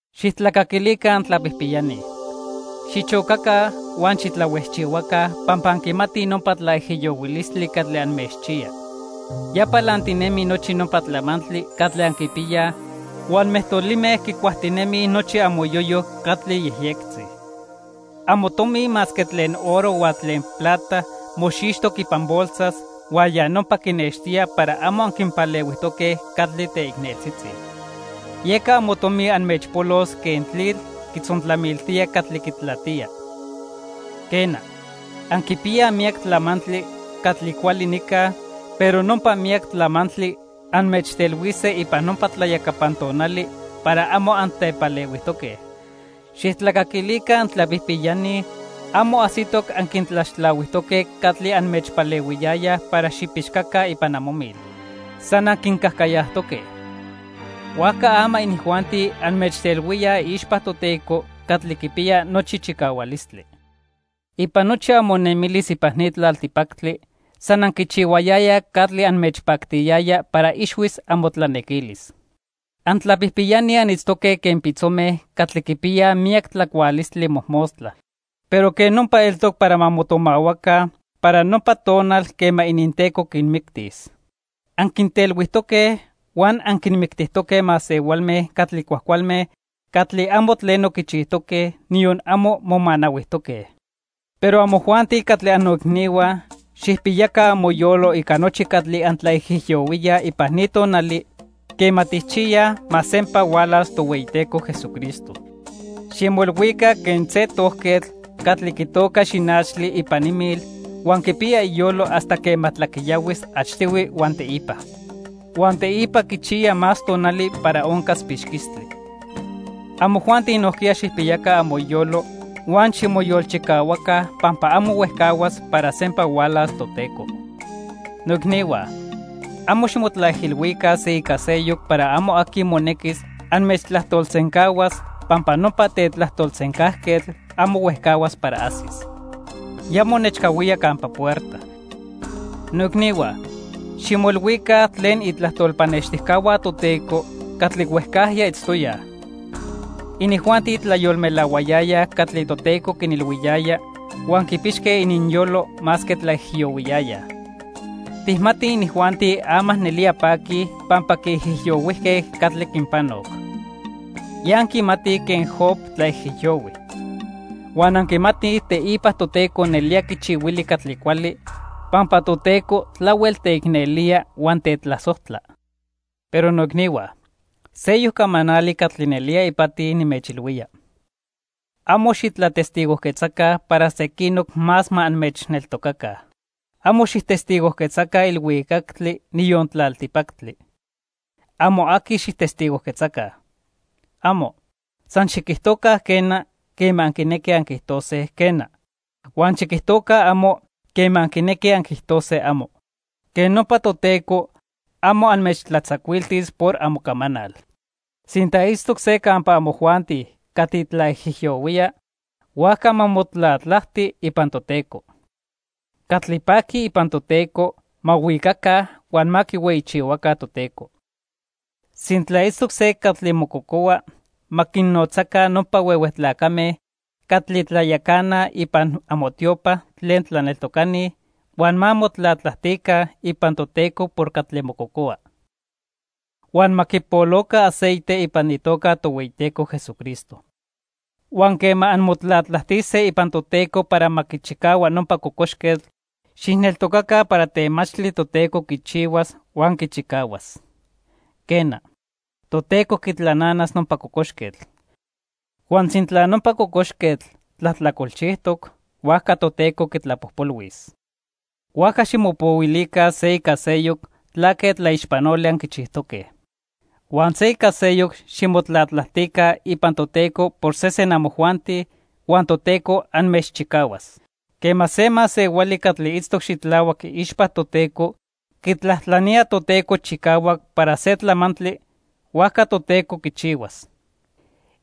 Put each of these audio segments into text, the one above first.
Xijtlacaquilica antlapijpiyani. Xichocaca huan xitlahuejchihuaca pampa anquimatij nopa tlaijiyohuilistli catli anmechchiya. Ya palantinemi nochi nopa tlamantli catli anquipiyaj, huan mejtolime quicuajtinemij nochi amoyoyo catli yejyectzi. Amotomi masque tlen oro huan tlen plata moxixtoc ipan bolsas, huan ya nopa quinextía para amo anquinpalehuijtoque catli teicneltzitzi. Yeca amotomi anmechpolos quen tlitl quitzontlamiltía catli quitlatía. Quena, anquipiyaj miyac tlamantli catli cuali nica, pero nopa miyac tlamantli anmechtelhuise ipan nopa tlayacapan tonali para amo antepalehuijtoque. Xijtlacaquilica antlapijpiyani, amo ajsitoc anquintlaxtlahuijtoque catli anmechpalehuiyayaj para xipixcaca ipan amomil. San anquincajcayajtoque. Huajca ama inijuanti anmechtelhuíaj iixpa Toteco Catli Quipiya Nochi Chicahualistli. Ipan nochi amonemilis ipan ni tlaltipactli, san anquichihuayayaj catli anmechpactiyaya para ixhuis amotlanequilis. Antlapijpiyani anitztoque quen pitzome catli quipiyaj miyac tlacualistli mojmostla. Pero quej nopa eltoc para ma motomahuaca para nopa tonal quema ininteco quinmictis. Anquintelhuijtoque huan anquinmictijtoque masehualme catli cuajcualme catli amo tleno quichijtoque, niyon amo momanahuijtoque. Pero amojuanti catli annoicnihua, xijpiyaca amoyolo ica nochi catli antlaijiyohuíaj ipan ni tonali quema tijchiyaj ma sempa hualas Tohueyiteco Jesucristo. Ximoilhuica quen se tojquetl catli quitoca xinachtli ipan imil, huan quipiya iyolo hasta quema tlaquiyahuis achtihui huan teipa. Huan teipa quichiya más tonali para oncas pixquistli. Amojuanti nojquiya xijpiyaca amoyolo huan ximoyolchicahuaca pampa amo huejcahuas para sempa hualas Toteco. Noicnihua, amo ximotlaijilhuica se ica seyoc para amo aqui monequis anmechtlajtolsencahuas, pampa nopa tetlajtolsencajquetl amo huejcahuas para ajsis. Ya monechcahuía campa puerta. Noicnihua, ximoilhuica tlen itlajtol pannextijcahua Toteco catli huejcajya itztoyaj. Inijuanti tlayolmelahuayayaj catli Toteco quinilhuiyaya huan quipixque ininyolo masque tlaijiyohuiyayaj. Tijmatij inijuanti ama nelía paquij pampa quiijiyohuijque catli quinpanoc. Ya anquimatij quen Job tlaijiyohui. Huan anquimatij teipa Toteco nelía quichihuili catli cuali pampa Toteco tlahuel teicnelía huan tetlasojtla. Pero noicnihua, seyoc camanali catli nelía ipati nimechilhuía. Amo xitlatestigojquetzaca para sequinoc más ma anmechneltocaca. Amo xijtestigojquetzaca ilhuicactli, niyon tlaltipactli. Amo aqui xijtestigojquetzaca. ¡Amo! San xiquijtoca "quena" quema anquinequij anquiijtose, "quena". Huan xiquijtoca "amo" quema anquinequij anquiijtose "amo". Quej nopa Toteco amo anmechtlatzacuiltis por amocamanal. Sintla itztoc se campa amojuanti catli tlaijiyohuía, huajca ma motlatlajti ipan Toteco. Catli paquij ipan Toteco, ma huicaca huan ma quihueyichihuaca Toteco. Sintla itztoc se catli mococohua, ma quinnotzaca nopa huehue tlacame catli tlayacanaj ipan amotiopa tlen tlaneltocani, huan ma motlatlajtica ipan Toteco por catli mococohua. Huan ma quipoloca aceite ipan itoca Tohueyiteco Jesucristo. Huan quema anmotlatlajtise ipan Toteco para ma quichicahua nopa cocoxquetl, xijneltocaca para temachtli Toteco quichihuas, huan quichicahuas. Quena, Toteco quitlananas nopa cocoxquetl. Huan sintla nopa cocoxquetl tlajtlacolchijtoc, huajca Toteco quitlapojpolhuis. Huajca ximopohuilica se ica seyoc tlaque tlaixpanoli anquichijtoque. Huan se ica seyoc ximotlatlajtica ipan Toteco por sesen amojuanti, huan Toteco anmechchicahuas. Quema se masehuali catli itztoc xitlahuac iixpa Toteco quitlajtlanía Toteco chicahuac para se tlamantli, huajca Toteco quichihuas.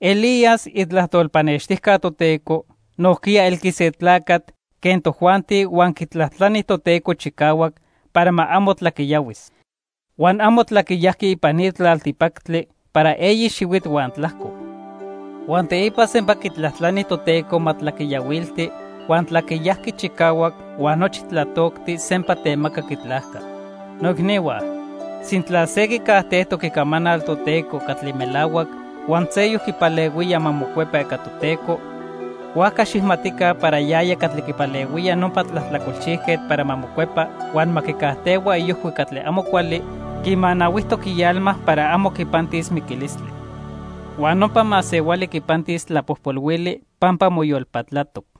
Elías, itlajtol pannextijca Toteco, nojquiya elqui se tlacatl quen tojuanti huan quitlajtlani Toteco chicahuac para ma amo tlaquiyahuis. Huan amo tlaquiyajqui ipan ni tlaltipactli para eyi xihuitl huan tlajco. Huan teipa sempa quitlajtlani Toteco ma tlaquiyahuilti, huan tlaquiyajqui chicahuac huan nochi tlatoctli sempa temacac itlajca. Noicnihua, sintla se quicajtejtoc Icamanal Toteco catli melahuac, huan seyoc quipalehuía ma mocuepa ica Toteco, huajca xijmatica para yaya catli quipalehuía nopa tlajtlacolchijquetl para ma mocuepa huan ma quicajtehua iojhui catli amo cuali, quimanahuijtoc ialma para amo quipantis miquilistli. Huan nopa masehuali quipantis tlapojpolhuili pampa moyolpatlatoc.